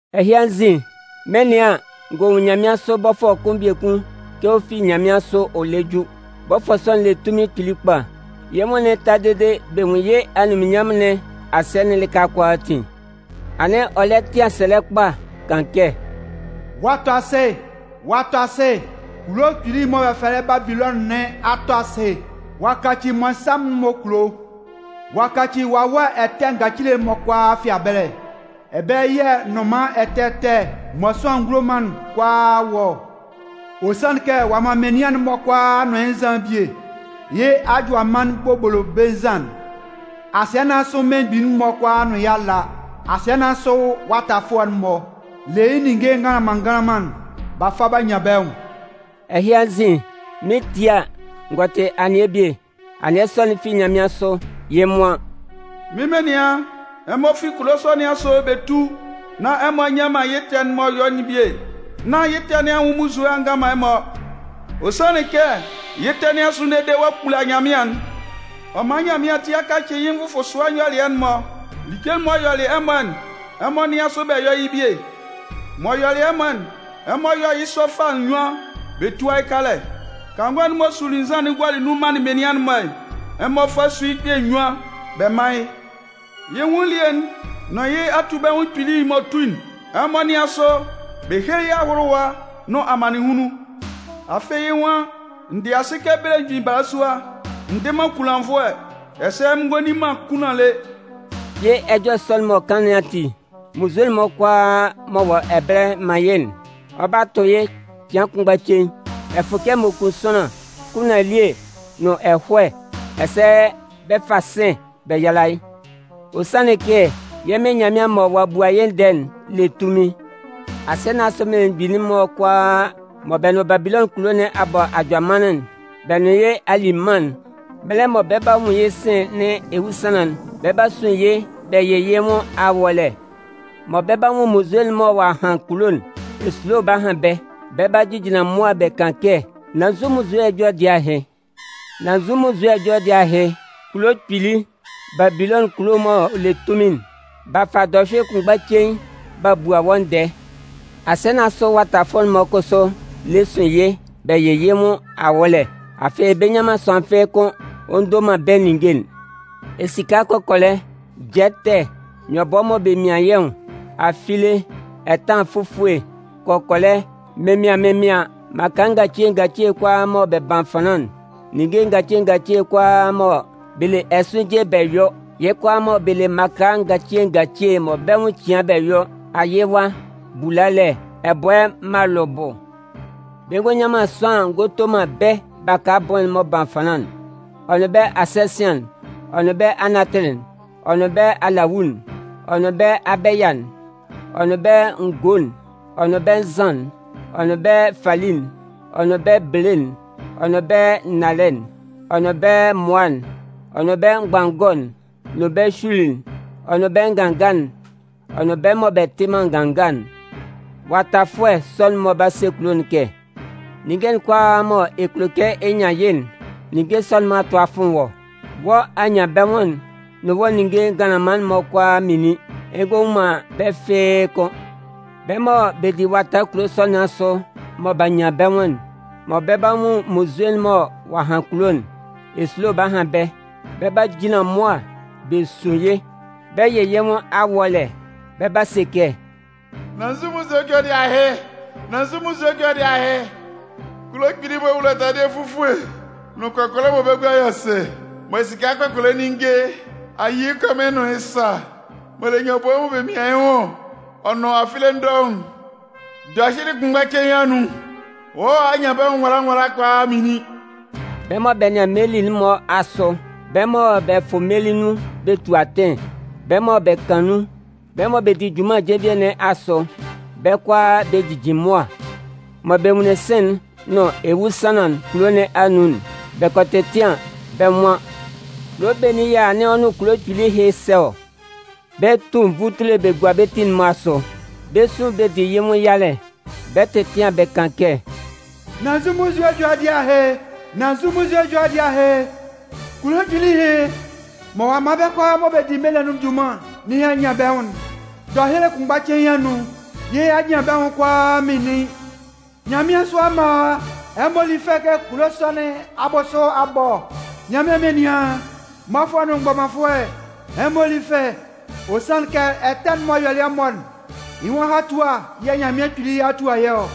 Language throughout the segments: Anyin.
Ɛhɩ anzin, mɩn 'nɩan an, n gɔ nwun nyanmɩansʋ bɔfʋɛ kʋn biekun kɛ ɔ fi nyanmɩansʋ ɔ lɛ ju. Bɔfʋɛ sɔ'n le tunmin kpili kpa. Yɩ́ nwʋn'n ta dede bɛ nwun yɩ́ anunminnyanmʋn nɩn asɩɛ'n lɩka kʋalaatin. Anɩn ɔ lɛ tɩan sɛlɛ kpa kan kɛ: “Ɔ'a tɔ asɩ! Ɔ'a tɔ asɩ! Kulo kpili'n mɔ bɛ fɛlɛ yɩ́ Babilɔnʋn nɩn a tɔ asɩ! Ɔ'a kaci mmɔnsanmʋn'n-mɔ kulo. Ɔ'a kaci wawɛ ɛtɛ ngacile'n-mɔ kʋalaa fɩabɛlɛ. Ɛbɛlɛ yɛ̂ nnʋnman ɛtɛ ɛtɛ mɔ sʋanlan ngulo man'n kʋalaa wɔ ɔ. Ɔ sanlɩn kɛ ɔ'a man menian'n-mɔ kʋalaa a nʋn yɩ́ nzan'n bie, yɩ́ ajʋamannɩn bobolobe nzan'n. Asɩɛ nɩn asʋ mmelemgbin'n-mɔ kʋalaa nʋn yɩ́ a la. Asɩɛ nɩn asʋ watafʋɛ'n-mɔ le yɩ́ ninnge nganlanman nganlanman'n b'a fa b'a nyan bɛ́ nwʋn.” Ɛhɩ anzin, mɩn 'tie a, n gɔ tɩ anɩɛ bie. Anɩɛ sɔ'n fi nyanmɩansʋ. Yɩ́ nwan: “Mɩ́n menian, ɛmɔ fi kulo sɔ nɩn asʋ bɛ tú nán ɛmɔ a nyɔ man yɩ́ ɛtɛ'n m'ɔ yɔ'n bie, nán yɩ́ ɛtɛ nɩn anwʋn munnzue a ngan man ɛmɔ. Ɔ sanlɩn kɛ yɩ́ ɛtɛ nɩn a sʋn dede ɔ'a kpula nyanmɩan'n. Ɔ man Nyanmɩan ati a kacɩ yɩ́ nvʋfʋsʋɛ nyɔlɩɛ'n-mɔ. Like'n m'ɔ yɔlɩ ɛmɔ'n, ɛmɔ nɩ́an sʋ bɛ yɔ́ yɩ́ bie. M'ɔ yɔlɩ ɛmɔ'n, ɛmɔ yɔ́ yɩ́ sɔ fâ nnyuan bɛ túa yɩ́ kalɛ. Kangɔ'n m'ɔ suli nzan'n gualɩ nun manlɩn menian'n-mɔ'n, ɛmɔ fá sú yɩ́ kpɛ̂ nnyuan bɛ mán yɩ́. Yɩ́ nwʋn elie'n nʋn yɩ́ atubɛnwʋn kpili'n m'ɔ tu'n, ɛmɔ nɩ́an sʋ bɛ héle yɩ́ ahʋlʋwa nʋn amannɩnhunlun. Afɩ yɩ́ nwan: ‘N dɩ asɩ kɛ belemgbin balasua. N dɩ man kunlannvʋɛ. Ɛsɛ mɩn ngɔ li man kunlan lé.’ Yɩ́ ɛjɔlɛ sɔ'n m'ɔ kan nɩn ati, munnzue'n-mɔ kʋalaa m'ɔ wɔ ɛbɛlɛ man yɩ́'n, ɔ 'ba tʋ yɩ́ cɩan kʋnmgba cein: Ɛfʋkɛ m'ɔ kun sʋanlan, kunlan elie nʋn ɛhɔɛ, ɛsɛ bɛ 'fa sɩ̂n bɛ yala yɩ́. Ɔ sanlɩn kɛ yɛ́ Mɩn Nyanmɩan mɔ ɔ'a bua yɩ́ ndɛɛ'n le tunmin. “Asɩɛ nɩn asʋ mmelemgbin'n-mɔ kʋalaa mɔ bɛ nʋn Babilɔnʋn kulo nɩn a bɔ ajʋamannɩn, bɛ nʋn yɩ́ a li mân'n, mɛlɛ mɔ bɛ 'ba nwun yɩ́ sɩ̂n nɩn ewusanlan'n, bɛ 'ba sun yɩ́ bɛ yɩ yɩ́ nwʋn awɔ́lɛ. Mɔ bɛ 'ba nwun munnzue'n mɔ ɔ'a han kulo'n, esulo 'ba han bɛ́. Bɛ 'ba jejinlan mʋa bɛ kan kɛ: ‘Nan nzu munnzue ɛjɔlɛ dɩɛ ahɩ? Nan nzu munnzue ɛjɔlɛ dɩɛ ahɩ? Kulo kpili, Babilɔnʋn kulo m'ɔ le tunmin! B'a fa dɔhyʋɩlɩ kʋnmgba cein b'a bua wɔ́ ndɛɛ!’ “Asɩɛ nɩn asʋ watafʋɛ'n-mɔ kʋsʋ lɛ sun yɩ́ bɛ yɩ yɩ́ nwʋn awɔ́lɛ. Afɩ bɛ nnyan man sʋanlan fɩ́ɩ́ kʋ́n ɔ ndo man bɛ́ ninnge'n: Esika kɔkɔlɛ, jɛtɛ, nyɔbʋɛ mɔ bɛ mian yɩ́ nwʋn, afile, ɛtanlan fufue, kɔkɔlɛ, mɩnmɩaɩn mɩnmɩaɩn, mmaka ngacile ngacile kʋalaa mɔ bɛ ban fanlan, ninnge ngacile ngacile kʋalaa mɔ bɛ le ɛsʋɩnje bɛ yɔ, yɩ́ kʋalaa mɔ bɛ le mmaka ngacile ngacile mɔ yɩ́ nwʋn cian bɛ yɔ, ayɩwa, bulalɛ, ɛbʋɛ malʋbʋ. Bɛ ngɔ nyan man sʋanlan ngɔ to man bɛ́ baka abʋɩn'n m'ɔ ban fanlan'n, ɔ nʋn bɛ́ asɛsɩan'n, ɔ nʋn bɛ́ anatɩlɩ'n, ɔ nʋn bɛ́ alawu'n, ɔ nʋn bɛ́ abɛya'n, ɔ nʋn bɛ́ ngo'n, ɔ nʋn bɛ́ nzan'n, ɔ nʋn bɛ́ fali'n, ɔ nʋn bɛ́ bele'n, ɔ nʋn bɛ́ nnalɛ'n, ɔ nʋn bɛ́ mmʋa'n, ɔ nʋn bɛ́ mgbanngɔ'n, nʋn bɛ́ hyuili'n, ɔ nʋn bɛ́ nganga'n, ɔ nʋn bɛ́ mɔ bɛ tɩ man nganga'n. “Watafʋɛ sɔ'n-mɔ 'ba se kulo'n kɛ: ‘Ninnge'n kʋalaa mɔ ɛ kulo kɛ ɛ nyan yɩ́'n, ninnge sɔ'n-mɔ a tʋ a fʋn wɔ́. Wɔ́ anyanbɛnwʋn'n nʋn wɔ́ ninnge nganlanman'n-mɔ a minlin, ɛ ngɔ nwun man bɛ́ fɩ́ɩ́ kʋ́n.’ Bɛ́ mɔ bɛ di wata kulo sɔ nɩn asʋ mɔ b'a nyan bɛ́ nwʋn'n, mɔ bɛ 'ba nwun munnzue'n mɔ ɔ'a han kulo'n, esulo 'ba han bɛ́. Bɛ 'ba jinlan mʋa bɛ sun yɩ́ bɛ yɩ yɩ́ nwʋn awɔ́lɛ. Bɛ 'ba se kɛ: ‘Nan nzu munnzue ɛjɔlɛ dɩɛ ahɩ? Nan nzu munnzue ɛjɔlɛ dɩɛ ahɩ? Kulo kpili'n m'ɔ wula taladɩɛ fufue nʋn kɔkɔlɛ mɔ bɛ́ gua yɔ sɩ mɔ esika kɔkɔlɛ ninnge a yi yɩ́ kɔmɩn nʋn yɩ́ sa, m'ɔ le nyɔbʋɛ mɔ bɛ mian yɩ́ nwʋn, ɔ nʋn afile dɔʋn'n, dɔhyʋɩlɩ kʋnmgba cein anun, wɔ́ anyanbɛnwʋn nwala nwala ɛhɩ kʋalaa a minlin!’ “Bɛ mɔ bɛ nɩan meli'n-mɔ asʋ, bɛ́ mɔ bɛ fʋ meli nun bɛ tu atɩn, bɛ́ mɔ bɛ kan nun, bɛ́ mɔ bɛ di junman jenvie nɩn asʋ, bɛ́ kʋalaa bɛ jijin mʋa. “Mɔ bɛ nwunlin sɩ̂n'n nʋn ewusanlan'n kulo nɩn anun'n, bɛ kɔ tɛtɩan bɛ́ nwan: ‘Kulo benin yɛ̂ anɩn ɔ nʋn kulo kpili ɛhɩ sɛ ɔ?’ Bɛ 'tu nvutule bɛ gua bɛ́ ti'n-mɔ asʋ. Bɛ 'sun bɛ di yɩ́ nwʋn yalɛ, bɛ 'tɛtɩan bɛ kan kɛ: ‘Nan nzu munnzue ɛjɔlɛ dɩɛ ahɩ? Nan nzu munnzue ɛjɔlɛ dɩɛ ahɩ? Kulo kpili ɛhɩ mɔ ɔ'a man bɛ́ kʋalaa mɔ bɛ di meli nɩn anun junman nɩn a nyan bɛ́ nwʋn'n, dɔhyʋɩlɩ kʋnmgba cein anun, yɩ́ anyanbɛnwʋn'n kʋalaa a minlin! Nyanmɩansʋ amma, ɛmɔ lí fɛ kɛ kulo sɔ nɩn abʋsʋ a bɔ ɔ! Nyanmɩan menian, mmɔfʋɛ nʋn mgbɔmanfʋɛ, ɛmɔ lí fɛ! Ɔ sanlɩn kɛ ɛtɛ'n m'ɔ yɔlɩ ɛmɔ'n, yɩ́ nwʋn ahatua yɛ̂ Nyanmɩan Kpili a tua yɩ́ ɔ.’”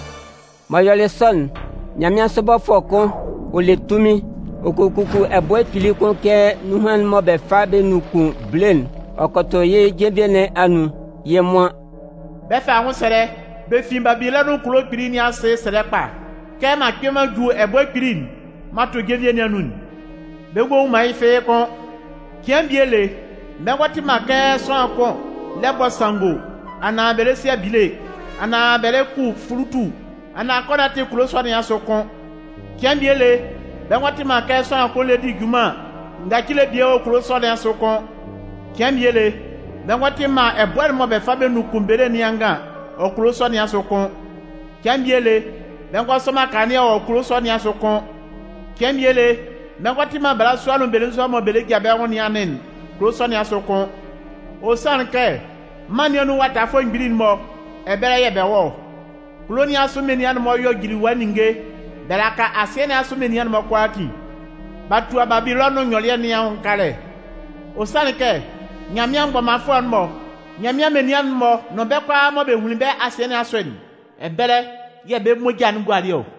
M'ɔ yɔlɩ sɔ'n, nyanmɩansʋ bɔfʋɛ kʋn, ɔ le tunmin, ɔ kɔ kuku ɛbʋɛ kpili kʋn kɛ nunhan'n mɔ bɛ fa bɛ nunkun bele'n ɔ kɔ tʋ yɩ́ jenvie nɩn anun. Yɩ́ nwan: “Bɛ 'fa anwʋnsɛlɛ bɛ fin Babilɔnʋn kulo kpili nɩn asɩ sɛlɛ kpa kɛ m'an kpɩn m'an ju ɛbʋɛ kpili'n m'an tʋ jenvie nɩn anun'n. Bɛ ngɔ nwun man yɩ́ fɩ́ɩ́ kʋ́n. Cɩan bie lé bɛ ngɔ tɩ man kɛ sʋanlan kʋn lɛ bɔ sanngo anaan bɛ lɛ si abile, anaan bɛ lɛ ku fulutu, anaan kɔnɔtɩ kulo sɔ nɩn asʋ kʋ́n. Cɩan bie lé bɛ ngɔ tɩ man kɛ sʋanlan kʋn lɛ di junman ngacile bie wɔ kulo sɔ nɩn asʋ kʋ́n. Cɩan bie lé, bɛ ngɔ tɩ man ɛbʋɛ'n m'ɔ bɛ fa bɛ nunkun bele nɩn angan wɔ kulo sɔnɩn asʋ kʋ́n. Cɩan bie lé bɛ ngɔ sɔ man kanlannɩɛ wɔ kulo sɔ nɩn asʋ kʋ́n. Cɩan bie lé bɛ ngɔ tɩ man balasua nʋn belenzua mɔ bɛ le ja bɛ́ nwʋn nɩn anɩn'n kulo sɔ nɩn asʋ kʋ́n. Ɔ sanlɩn kɛ mân nɩn anun watafʋɛ mgbili'n-mɔ, ɛbɛlɛ yɛ̂ bɛ wɔ ɔ. Kulo nɩn asʋ menian'n-mɔ yɔ jiliwa ninnge bɛ laka asɩɛ nɩn asʋ menian'n-mɔ kʋalaatin. B'a tua Babilɔnʋn nyɔlɩɛ nɩn anwʋn kalɛ. Ɔ sanlɩn kɛ, Nyanmɩan mgbɔmanfʋɛ'n-mɔ, Nyanmɩan menian'n-mɔ nʋn bɛ́ kʋalaa mɔ bɛ hunlin bɛ́ asɩɛ nɩn asʋ'n, ɛbɛlɛ yɛ̂ bɛ́ moja'n gualɩ ɔ.”